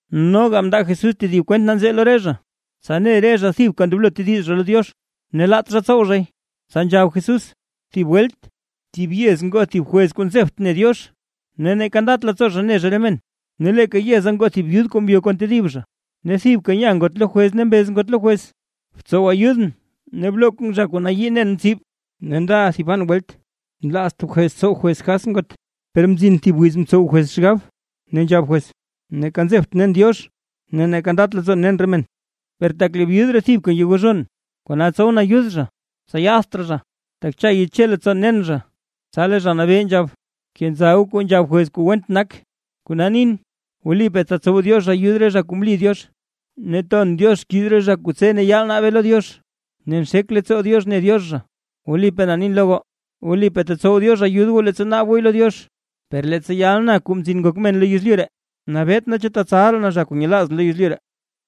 Noga mndaa Jesús tedib kwent nanzee lo re zha, tsa ne re zha thibka ndoblo tediz zha lo Diox, ne laat zha tsow zhay. Tsa nzhab Jesús: ―Thib welt thib yez ngoo thib jwez kuu nzebt ne Diox ne neeka ndat leettsoo zha ne zha re men. Ne leeka yeza ngoo thib byud kuu ngyo kon tedib zha, ne thibka nya ngot lo jwez ne mbez ngot lo jwez: “¡Btsow ayudʼn ne bloo zha kuu nayii nen tsib!” Ne ndaʼa thiban welt nlaazt jwez tsow jwez kas ngot, per mzin thib wiz mtsow jwez xgab, ne nzhab jwez: “Neeka nzebtʼn nen Diox ne neeka ndat leettsoon nen re men, per tak lee byud ree thibka ngegozhon, kona tsowʼn ayud zha, tsa yaadt raa zha, tak cha yeche leettsoon nen zha”. Tsa lee Zha Nabee nzhab: ―Bkenza goo kuu nzhab jwez kuu went nak. Kona nin, wlipaa tetsow Diox ayud re zha kuu mli Diox ne ton Diox xkiiz re zha kuu tse ne yaal naabe lo Diox, ne nxek leettsoo Diox ne Diox zha. Wlipaa na nin lo goo, wlipaa tetsow Diox ayud goo leettsa naab gooy lo Diox. Per leettsa yal na, Kuu Mzin Ngok Men lo yezlyu ree, ¿nabet naa chu tetsal raa na zha kuu nyelaazʼn lo yezlyu ree?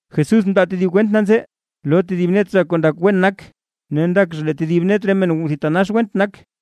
Jesús mndaa tedib kwent nanzee lo tedib net re zha kuu ndak wen nak, ne ndak zha lee tedib net re men thitanax went nak.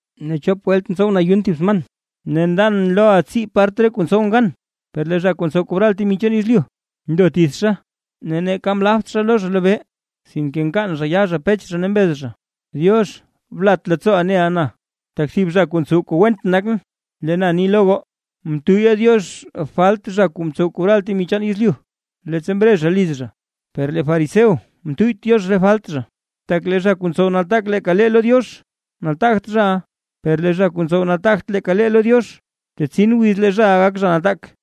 Ne chop welt ntsowʼn ayun thib sman, ne ndan loʼa tsii part lo re kuu ntsowʼn gan.” Per lee zha kuu ntsow kobral temi chaan yezlyu ndo tithxa, ne neeka mlapt zha lo zha lobee, sinke nkaan yaa zha pech zha ne mbez zha: “Diox, blat leettsooʼa neʼa na, tak thib zha kuu ntsow kuu went nakʼn”. Lee na ni lo goo, mtuyya Diox falt zha kuu ntsow kobral temi chaan yezlyu, leettsa mre zha liz zha, per lee fariseo mtuyyt Diox re falt zha. Tak lee zha kuu ntsow nataak leeka lee lo Diox, nataagt zhaʼa, per lee zha kuu ntsow nataagt leeka lee lo Diox, tetsin wiz lee zhaʼa gak zha nataak.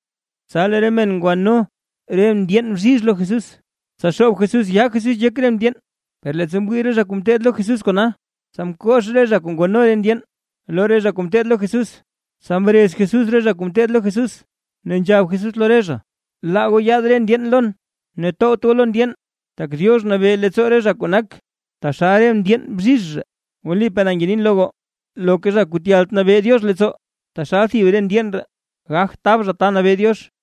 Tsa lee re men ngwano re ndyeen bzhizh lo Jesús, tsa xoob Jesús yaa Jesús yek re ndyeen. Per leettsa mwii re zha kuu ngeteed lo Jesús kona, tsa mkox re zha kuu ngwano re ndyeen lo re zha kuu ngeteed lo Jesús. Tsa mrez Jesús re zha kuu ngeteed lo Jesús, ne nzhab Jesús lo re zha: ―Laa goo yaad re ndyeen lon, ne towt goo lo ndyeen. Tak Diox nabee leettsoo re zha kuu nak taxal re ndyeen bzhizh ree. Wlipaa na ngenin lo goo, loka zha kuu tyalt nabee Diox leettsoo, taxal thib re ndyeen ree, gagt tab zha ta nabee Diox.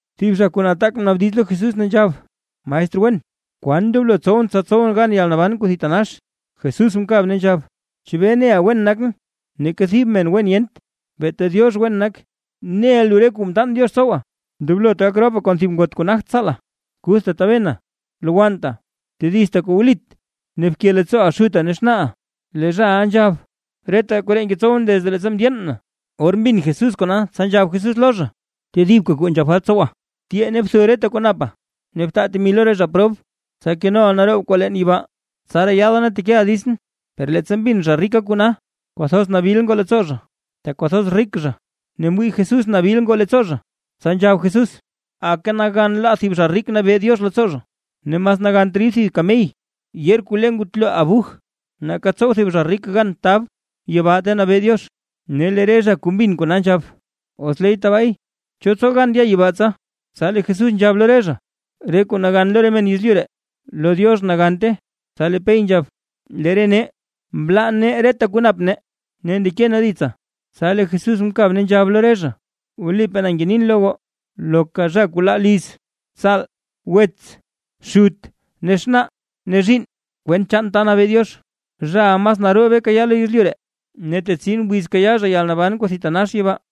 Thib zha kuu nataak mnaabdiz lo Jesús, ne nzhab: ―Maestr wen, ¿kwan ndoblo tsowʼn, tsa tsowʼn gan yalnaban kuu thitanax? Jesús mkab ne nzhab: ―¿Chebee neʼa wen nakʼn? Neeka thib men wen yent, beeta Diox wen nak. Neʼa lu re kuu mtaan Diox tsowa: “Ndoblot gak ropa kon thib ngot kuu nagt tsaala, kuthta tabena, lowannta, tedizta kuu wlit, ne bke leettsooʼaa xutaa ne xnaaʼa”. Lee zhaʼa nzhab: ―Reta koree ngetsowʼn desde leettsa mndyeen na. Or mbin Jesús kona, tsa nzhab Jesús lo zha: ―Tedibka kuu nzhak falt tsowa. Tyee, ne btho reta kuu napa ne btaa temi lo re zha prob, tsa kenoʼa naroob kwaa leen yibaa, tsaraa yaada ne tekeʼa ditsʼn. Per leettsa mbin zha rika kona, kwathoz nabil ngoo leettsoo zha, tak kwathoz rik zha. Ne mwii Jesús nabil ngoo leettsoo zha, tsa nzhab Jesús: ―¡Aka nagan laa thib zha rik nabee Diox leettsoo zha! Ne mas nagant rid thib kamey yeer kuu le ngutlo abuj, nake tsow thib zha rik gan tab yibaa ta nabee Diox. Ne lee re zha kuu mbin kona nzhab: ―¿Os leey tabaay cho tsow gan ndya yibaa tsa? Tsa lee Jesús nzhab lo re zha: ―Re kuu nagan lo re men yezlyu ree, lo Diox nagante. Tsa lee Pey nzhab: ―Lee re nee, mlaa nee reta kuu nap nee, ne ndeke nee ditsa. Tsa lee Jesús mkab, ne nzhab lo re zha: ―Wlipaa na ngenin lo goo, loka zha kuu laa liz, tsaal, wets, xut ne xnaa, ne zhiinn kwent chaan ta nabee Diox, zhaʼa mas naroobe kayaa lo yezlyu ree, ne tetsin wiz kayaa zha yalnaban kuu thitanax yibaa.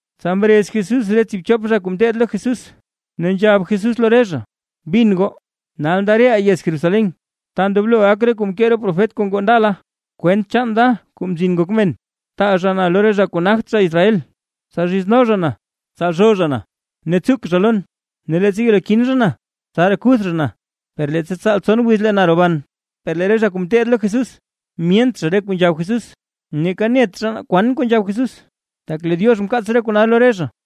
Tsa mrez Jesús re tsiibchop zha kuu ngeteed lo Jesús, ne nzhab Jesús lo re zha: ―Bin goo, nal nda reʼaa yez Jerusalén, ta ndoblo gak reta kuu mkee re profet kuu ngoo ndala, kwent chaan da, Kuu Mzin Ngok Men. Taa zha na lo re zha kuu nagt zha Israel, tsa zhizno zha na, tsalzhoo zha na ne tsuk zha lon. Ne leettsa yelo kin zha na, tsaraa kuth zha na, per leettsa tsaal tson wiz lee na roban. Per lee re zha kuu ngeteed lo Jesús, myent zha re kuu nzhab Jesús, ne neeka net zha na kwan kuu nzhab Jesús, tak lee Diox mkaats re kona lo re zha.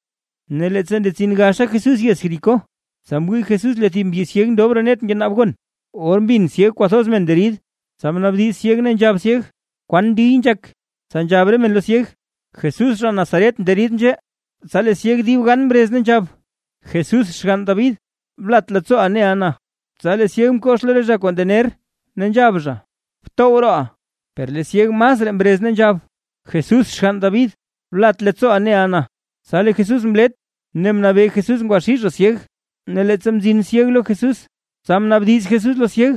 Ne leettsa ndetsin gaxa Jesús yez Jericó, tsa mwii Jesús lee thib mbyi syeg ndob roo net ngenaab gon. Or mbin syeg kwathoz men nderid, tsa mnaabdiz syeg ne nzhab syeg: ―¿Kwan ndiy nzhak? Tsa nzhab re men lo syeg: ―Jesús zha Nazaret nderid nzhee. Tsa lee syeg dib gan mrez, ne nzhab: ―¡Jesús xgann David, blat leettsooʼa neʼa na! Tsa lee syeg mkox lo re zha kuu ndener, ne nzhab zha: ―¡Btow rooʼa! Per lee syeg masraa mrez ne nzhab: ―¡Jesús xgann David, blat leettsooʼa neʼa na! Tsa lee Jesús mlet, ne mnabee Jesús ngwaxii zha syeg. Ne leettsa mzin syeg lo Jesús. Tsa mnaabdiz Jesús lo syeg: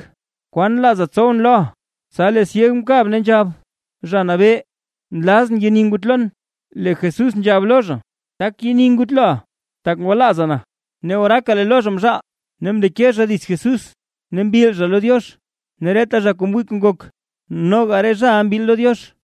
―¿Kwan nlaaza tsowʼn loʼa? Tsa lee syeg mkab ne nzhab: ―Zha Nabee, nlazʼn yeni ngutlon. Lee Jesús nzhab lo zha: ―Tak yeni ngutloʼa, tak ngwalaaza na. Ne oraaka lee lo zha mzhaal, ne mndeke zha dits Jesús ne mbil zha lo Diox. Ne reta zha kuu mwii kuu ngok, noga re zhaʼa mbil lo Diox.